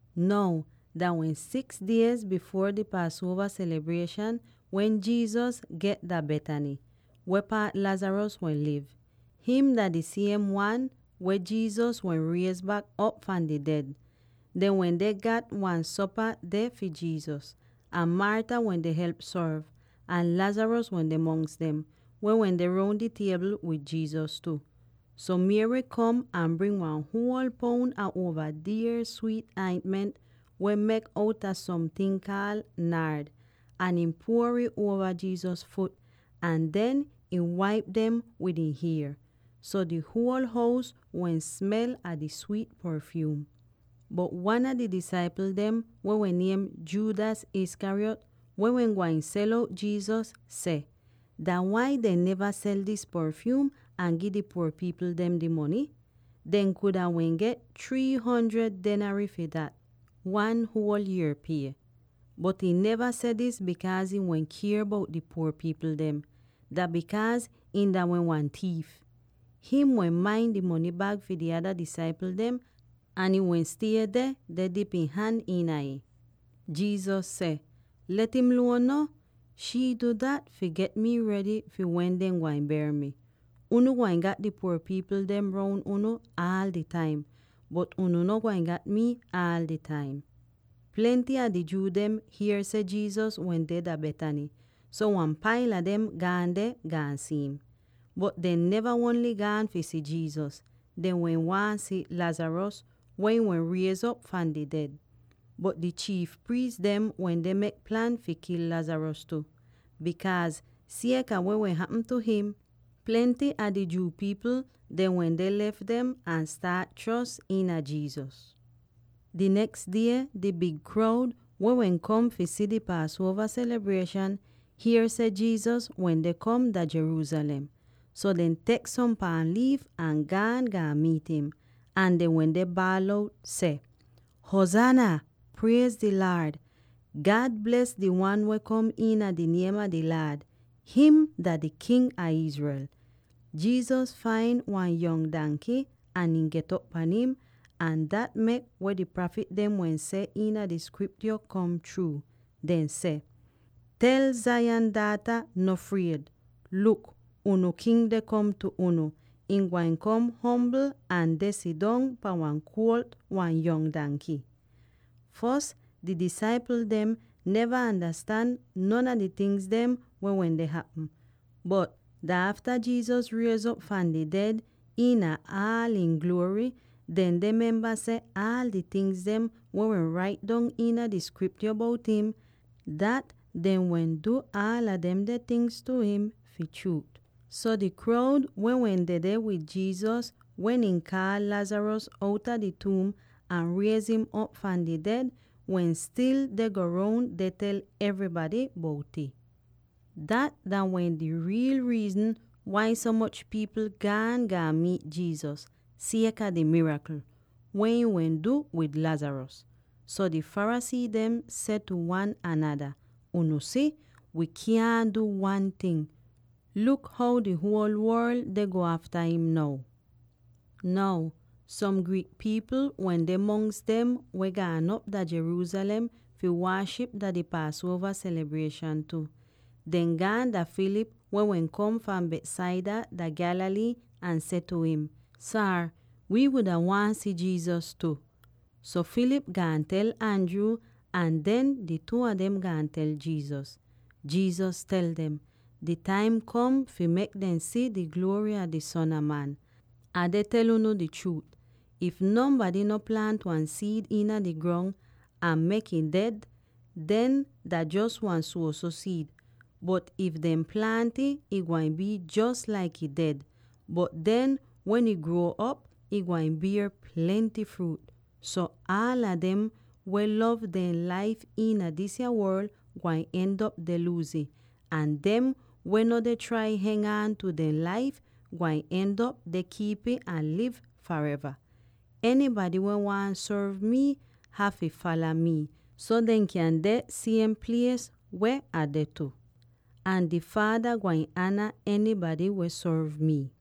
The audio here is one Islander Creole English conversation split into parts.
Now, dah wehn six diez bifuor di Paasuova selibrieshan wen Jesus get dah Bethany, weh paat Lazarus wehn liv. Him dah di siem wan weh Jesus wehn riez bak op fahn di ded. Dehn wende gat wan sopa deh fi Jesus, ahn Martha wende help sorv, ahn Lazarus wende mongs dem, weh wehn deh roun di tiebl wid Jesus tu. So, Mary kom ahn bring wan huol poun a uova dier swiit aintment weh mek outa somting kaal “naard,” ahn ihn puor'ih uova Jesus fut, ahn den ihn waip dem wid ihn hier. So di huol hous wehn smel a di swiit porfyuum. Bot wan a di disaipl dem weh wehn niem Judas Iscariot, weh wehn gwain sel out Jesus, seh, “Dah wai dehn neva sel dis porfyuum ahn gi di puor pipl dem di mony? Dehn kuda wehn get three hundred denarii fi dat, wan huol yier pie!” Bot ihn neva seh dis bikaaz ihn wehn kier bout di puor pipl dem; dah bikaaz ihn dah wehn wan tiif. Him wehn main di mony bag fi di ada disaipl dem ahn ihn wehn stie deh dip ihn han iina ih. Jesus seh, “Let im luon no! Shii du dat fi get mi redy fi wen dehn gwain ber mi. Unu gwain gat di puor pipl dem roun unu aal di taim, bot unu no gwain gat mii aal di taim.” Plenty a di Jew dem hier seh Jesus wende dah Bethany, so wan paila dem gaan deh, gaan si'im. Bot dehn neva ongl gaan fi si Jesus, dehn wehn waahn si Lazarus, weh ihn wehn riez'op fahn di ded. Bot di chiif priis dem wende mek plan fi kil Lazarus tu, bikaaz sieka weh wehn hapm tu him, plenty a Jew pipl dehn wende lef dem ahn staat chros iina Jesus. Di neks die di big kroud, weh wehn kom fi di Paasuova selibrieshan, hier seh Jesus wende kom dah Jerusalem. So dehn tek som paam liif ahn gaan, gaan miit im. Ahn dehn wende baal out seh, “Huzaana! Priez di Laad! Nuotis seh: “Huzaana” iina di Hebrew langwij miin “Siev” or “Priez.” God bles di wan weh kom iina di niem a di Laad! Him dah di King a Israel!” Jesus fain wan yong danky ahn ihn get'op pahn im; ahn dat mek weh di prafit dem wehn seh iina di Skriptyo kom chruu. Dehn seh, “Tel Zion daata, ‘No fried! Luk, fi unu King deh kom tu unu; ihn gwain kom ombl ahn deh sidong pahn wan kuolt, wan yong danky.’” Fos di disaipl dem neva andastan non a di tingz dem weh wende hapm. Bot dah afta Jesus riez'op fahn di ded iina aala ihn gluory, den dehn memba seh aal di tingz weh wehn rait dong iina di Skriptyo bout im, dat dehn wehn du aala demde tingz tu im fi chruut. So di kroud —weh wehn dedeh wid Jesus wen ihn kaal Lazarus outa di tuum ahn riez'im op fahn di ded— wehn stil deh go roun deh tel evrybady bout'ih. Dat dah wehn di riil riizn wai so moch pipl gaan, gaan miit Jesus, sieka di mirakl weh ihn wehn du wid Lazarus. So di Pharisee dem seh tu wan anada, “Unu si; wii kyaahn du wan ting. Luk how di huol worl deh go afta im now!” Now som Greek pipl wende mongs dem weh gaan op dah Jerusalem fi waaship dah di Paasuova selibrieshan tu. Dehn gaan dah Philip weh wehn kom fahn Bethsaida dah Galilee ahn seh tu im, “Saar, wi wuda waahn si Jesus tu.” So Philip gaan tel Andrew, ahn den di two a dem gaan tel Jesus. Jesus tel dem, “Di taim kom fi mek dem si di gluory a di Son a Man. Ah deh tel unu di chruut: if nonbady no plaant wan siid iina di grong ahn mek'ih ded, den dah jos wan suoso siid. Bot if dehn plaant'ih, ih gwain bii jos laik ih ded; bot den wen ih gruo'op, ih gwain bier plenty fruut. So, aala dem weh lov dehn laif iina disa worl, gwain end'op deh luuz ih; ahn dem weh no deh trai heng aan tu dehn laif, gwain end'op deh kiip'ih ahn liv fareva. Enybady weh waahn sorv mii hafy fala mii, so dehn kyan deh di siem plies weh Ah deh tu. Ahn di Faada gwain ana enybady weh sorv mii.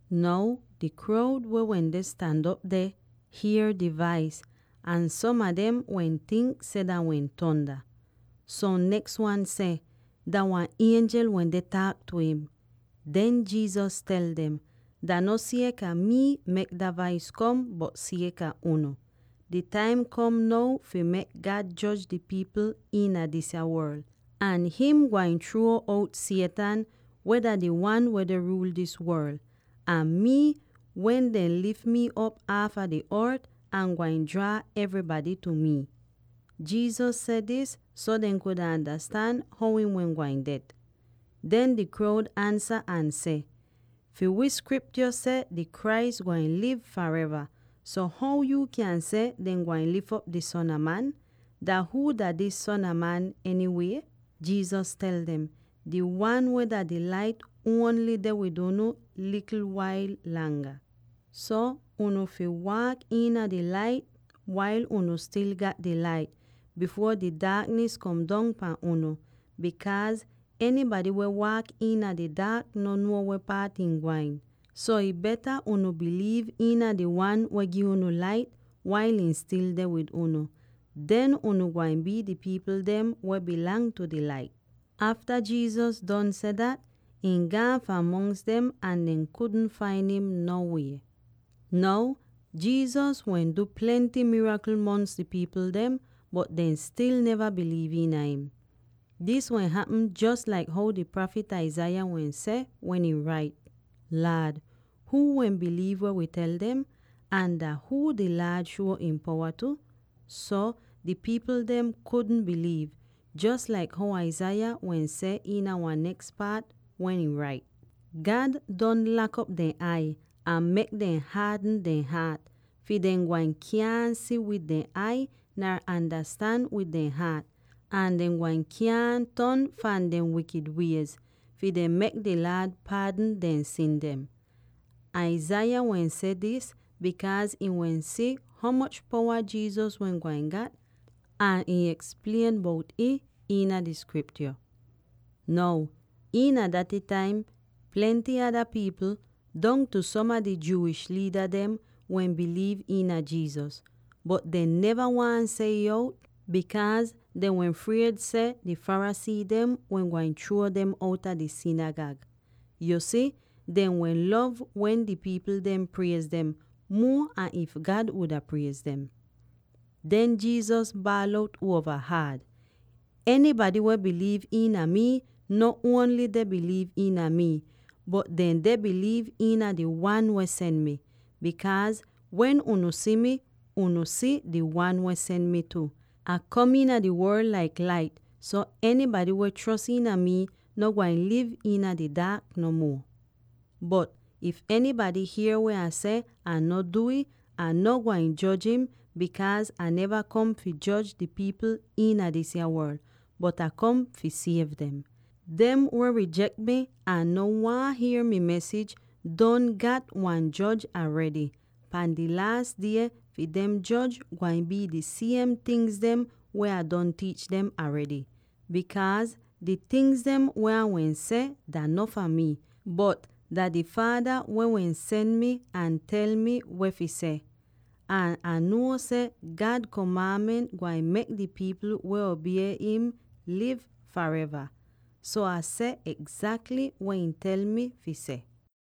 Now di kroud, weh wende stan op deh, hier di vais; ahn som a dem wehn tink seh dah wehn tonda. Som neks wan seh, “Dah wan ienjel wende taak tu im.” Den Jesus tel dem, “Dah no sieka mii mek dah vais kom, bot sieka unu. Di taim kom now fi mek God joj di pipl iina disa worl, ahn him gwain chruo out Satan, weh dah di wan weh deh ruul dis worl. Ahn mii, wen dehn lif mi op aafa di ort, Ah gwain draa evrybady tu mii.” Jesus seh dis so dehn kuda andastan how ihn wehn gwain ded. Den di kroud ansa ahn seh, “Fi wii Skriptyo seh di Christ gwain liv fareva. So how yuu kyan seh dehn gwain lif op di Son a Man? Dah huu dah dis ‘Son a Man’ enywie?” Jesus tel dem, “Di Wan weh dah di Lait ongl deh wid unu wan likl wail langa. So unu fi waak iina di lait wail unu stil gat di Lait, bifuor di daaknis kom dong pahn unu, bikaaz enybady weh waak iina di daak no nuo weh paat him gwain. So ih beta unu biliiv iina di Wan weh gi unu lait, wail ihn stil deh wid unu; den unu gwain bii di pipl dem weh dah fi di Lait.” Afta Jesus don seh dat, ihn gaan fahn mongs dem ahn dehn kudn fain im no wie. Now, Jesus wehn du plenty mirakl mongs di pipl dem, bot dehn stil neva biliiv iina im. Dis wehn hapm jos laik how di prafit Isaiah wehn seh, wen ihn rait: “Laad, huu wehn biliiv weh wi tel dem? Ahn dah huu di Laad shuo ihn powa tu?” So, di pipl dem kudn biliiv, jos laik how Isaiah wehn seh iina wan neks paat weh ihn rait: “God don lak'op dehn ai ahn mek dem haadn dehn haat, fi dehn gwain kyaahn si wid dehn ai nar andastan wid dehn haat, ahn dehn gwain kyaahn ton fahn dehn wikid wiez, fi dehn mek di Laad paadn dehn sin dem.” Isaiah wehn seh dis bikaaz ihn wehn si ho moch powa Jesus wehn gwain gat, ahn ihn eksplien bout'ih iina di Skriptyo. Now iina daty taim plenty ada pipl, dongtu som a di Jewish liida dem, wehn biliiv iina Jesus. Bot dehn neva waahn seh ih out, bikaaz dehn wehn fried seh di Pharisee dem wehn gwain chruo dem outa di sinigag. Yu si, dehn wehn lov wen di pipl dem priez dem, muo an if God wuda priez dem. Den Jesus baal out uova haad, “Enybady weh biliiv iina mii no ongl deh biliiv iina mii, bot dehn deh biliiv iina di Wan weh sen mi. Bikaaz wen unu si mii, unu si di Wan weh sen mi tu. Ah kom iina di worl laik lait, so enybady weh chros iina mi no gwain liv iina di daak no muo. “Bot, if enybady hier weh Ah seh ahn no du'ih, Ah no gwain joj im, bikaaz Ah neva kom fi joj di pipl iina disa worl, bot Ah kom fi siev dem. Dem weh rijek mii ahn no waahn hier mi mesij, don gat wan joj aredy; pahn di laas die, fi dem joj gwain bii di siem tingz weh Ah don tiich dem aredy. Bikaaz di tingz dem weh Ah wehn seh dah no fahn mii, bot dah di Faada weh wehn sen mi ahn tel mi weh fi seh. Ahn Ah nuo seh God komaanment gwain mek di pipl weh obie im liv fareva. So Ah seh egzakly weh ihn tel mi fi seh.”